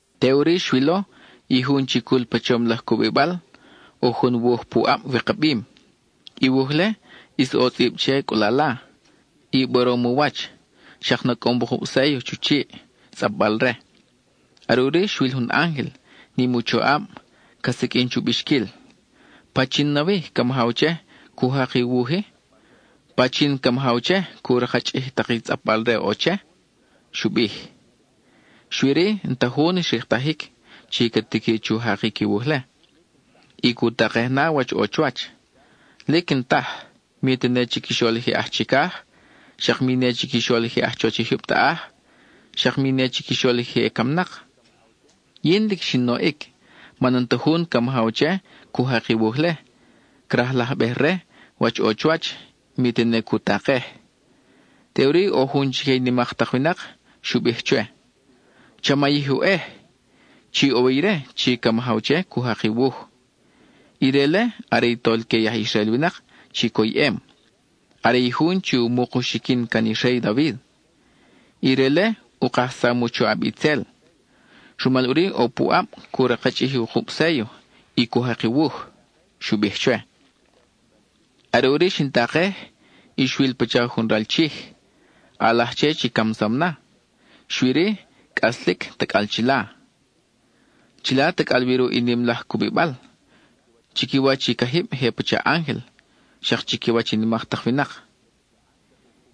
Teʼuri xwilo, i jun chi cul pa chom laj cubibal, ʼo jun wuj pu ʼab wikabim. I wuj-le, ʼis ʼo tzʼib che cʼulala, y borom u wach, xak nacʼom wukub séllo chu chiʼ, tzʼapbal-re. Are ʼuri xwil jun ángel, nim u choʼab, ca siqʼuin chu bixquil: ¿Pachin nawi ca majaw che, cu jak i wuj-i? ¿Pachin ca majaw che, cu rakchʼij i tak i tzʼapbal-re ʼo che? —xu bij. Xui-ri, n-ta jun xriktajic chi ca tiqui chu jakic i wuj-le y cu takej na wach ʼo chuwach; lic n-taj, mi tene chiquixol i je aj chicaj, xak mi ne chiquixol i je aj chuwach i jyub taʼaj, xak mi ne chiquixol i je camnak. Yin lic xin oʼic, man n-ta jun ca majaw che cu jak i wuj-le, crajlajbej-re wach ʼo chuwach, mi tene cu takej. Teʼuri ʼo jun chique i nimak tak winak xu bij chwe: —Cha mayij oʼej. Chi ʼo wi ire chi ca majaw che cu jak i wuj. Ire-le are i Tolque i aj Israel winak chi coyʼem, are i jun chi u muk u xiquin can i rey David. Ire-le u kajsam u choʼab itzel; rumal ʼuri ʼo puʼab cu rakchʼij i wukub séllo y cu jak i wuj —xu bij chwe. Are ʼuri xin takej, y xwil pacha jun ral Chij, ʼalaj che chi camsam na, xui-ri, cʼaslic tacʼal chila. Chila tacʼal wi ruʼ i nim laj cubibal, chiquiwach i cajib je pacha ángel, xak chiquiwach i nimak tak winak.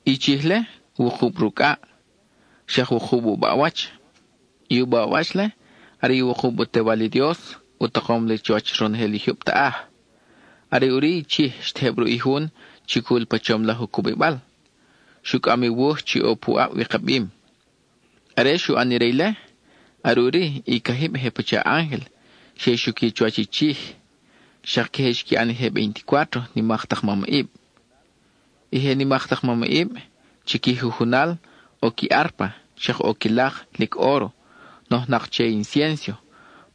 I Chij-le, wukub rucʼaʼ, xak wukub u baʼwach. I u baʼwach-le are i wukub u tewal i Dios u takom li chuwach ronojel i jyub taʼaj. Are ʼuri i Chij xtejeb ruʼ i jun chi cul pa chom laj u cubibal; xu cʼam i wuj chi ʼo pu ʼab wikabim. Are xu ʼan ire ile, are ʼuri i cajib je pacha ángel xe xuqui chuwach i Chij; xak queje xqui ʼan i je veinticuátro nimak tak mamʼib. I je nimak tak mamʼib, chi qui jujunal ʼo qui árpa, xak ʼo qui lak, lic óro, nojnak che inciénso,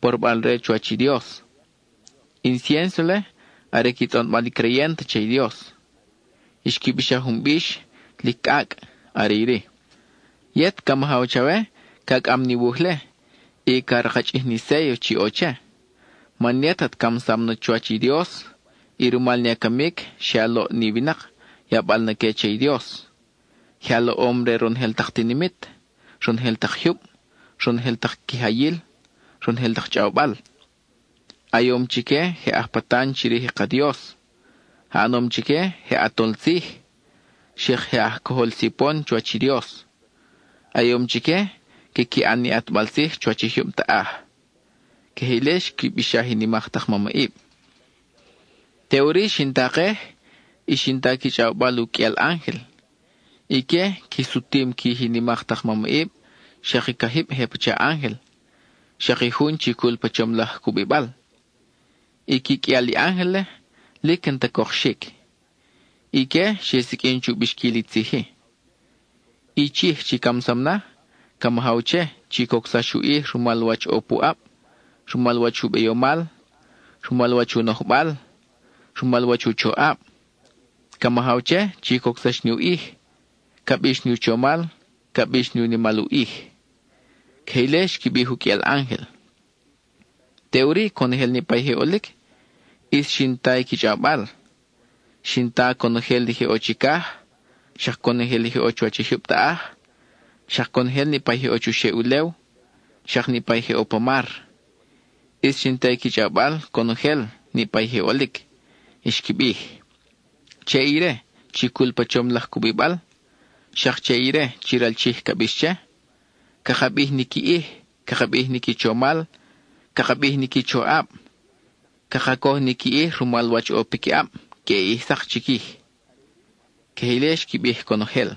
porobal re chuwach i Dios. I inciénso-le are qui tzʼonbal i creyent che i Dios. Xqui bixaj jun bix lic cʼacʼ; are iri: Yet ca majaw chawe ca cʼam ni wuj-le y ca rakchʼij ni séllo chi ʼo che; Man yet at camsam na chuwach i Dios, y rumal ni a camic xe a loʼ ni winak, yabal na que che i Dios. Je a loʼom re ronojel tak tinimit, ronojel tak jyub, ronojel tak quijayil, ronojel tak chʼawbal. A yom chique je aj patan chirij i ka Dios: a ʼanom chique je ʼatol tzij, xak je aj cojol sipon chuwach i Dios, a yom chique quiqui an ni ʼatbal tzij chuwach i jyub taʼaj. (Queje ile xqui bixaj i nimak tak mamʼib.) Teʼuri xin takej, y xin ta qui chʼawbal u qʼuial ángel; ique qui sutim quij i nimak tak mamʼib, xak i cajib je pacha ángel, xak i jun chi cul pa chom laj cubibal. I qui qʼuial i ángel-le, lic n-ta cokxic. Ique xe siqʼuin chu bixquil i tzij-i: I Chij chi camsam na, ca majaw che chi cocsax u ʼij rumal wach ʼo puʼab, rumal wach u beyomal, rumal wach u nojbal, rumal wach u choʼab. Ca majaw che chi cocsax ni u ʼij, ca bix ni u chomal, ca bix ni u nimal u ʼij. (Queje ile xqui bij i u qʼuial ángel.) Teʼuri conojel niʼpa i je ʼolic, ʼis xin ta i qui chʼawbal. Xin ta conojel i je ʼo chicaj, xak conojel i je ʼo chuwach i jyub taʼaj, xak conojel niʼpa je ʼo chuxeʼ ulew, xak niʼpa je ʼo pa mar; ʼis xin ta i qui chʼawbal conojel niʼpa i je ʼolic. Xqui bij: Che ire, chi cul pa chom laj cubibal, xak che ire chi ral Chij ca bix che, Caka bij ni qui ʼij, caka bij ni qui chomal, caka bij ni qui choʼab, Caka coj ni qui ʼij rumal wach ʼo piquiʼab queʼe ʼij sak chiquij. (Queje ile xqui bij conojel.)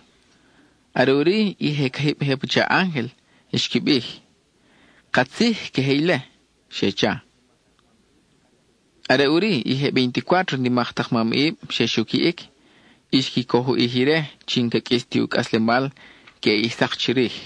Are ʼuri i je cajib je pacha ángel xqui bij: —¡Katzij, queje ile! —xe cha. Are ʼuri i je veinticuátro nimak tak mamʼib xe xuquiʼic, y xqui coj u ʼij ire chi n-ca qʼuis ti u cʼaslemal queʼe ʼij sak chirij.